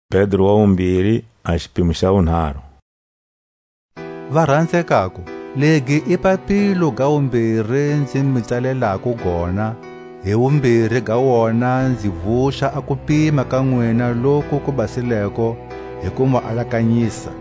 A xitsumbiso xa kuwuya ka Hosi. Varanzekako, legi i papilo ga wumbiri nzi mu tsalelako gona; hi wumbiri ga wona nzi vuxa a kupima ka nwina loku ku basileko hi ku mu alakanyisa,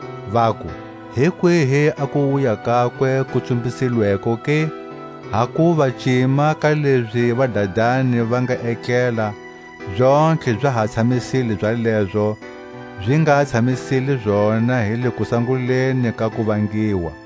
vaku: Hi kwihi a kuwuya kakwe ku tsumbisilweko ke? Hakuva cima ka lezi vadadani va nga etlela, zontlhe za ha tshamisile zalezo zi nga tshamisile zona hi le kusanguleni ka kuvangiwa.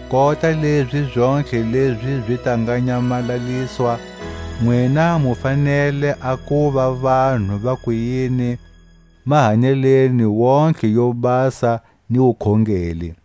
Kota lezi zontlhe lezi zi ta nga nyamalaliswa, nwina mu fanele a kuva vanhu ba kuyini mahanyeleni wontihe yo basa ni wukhongeli!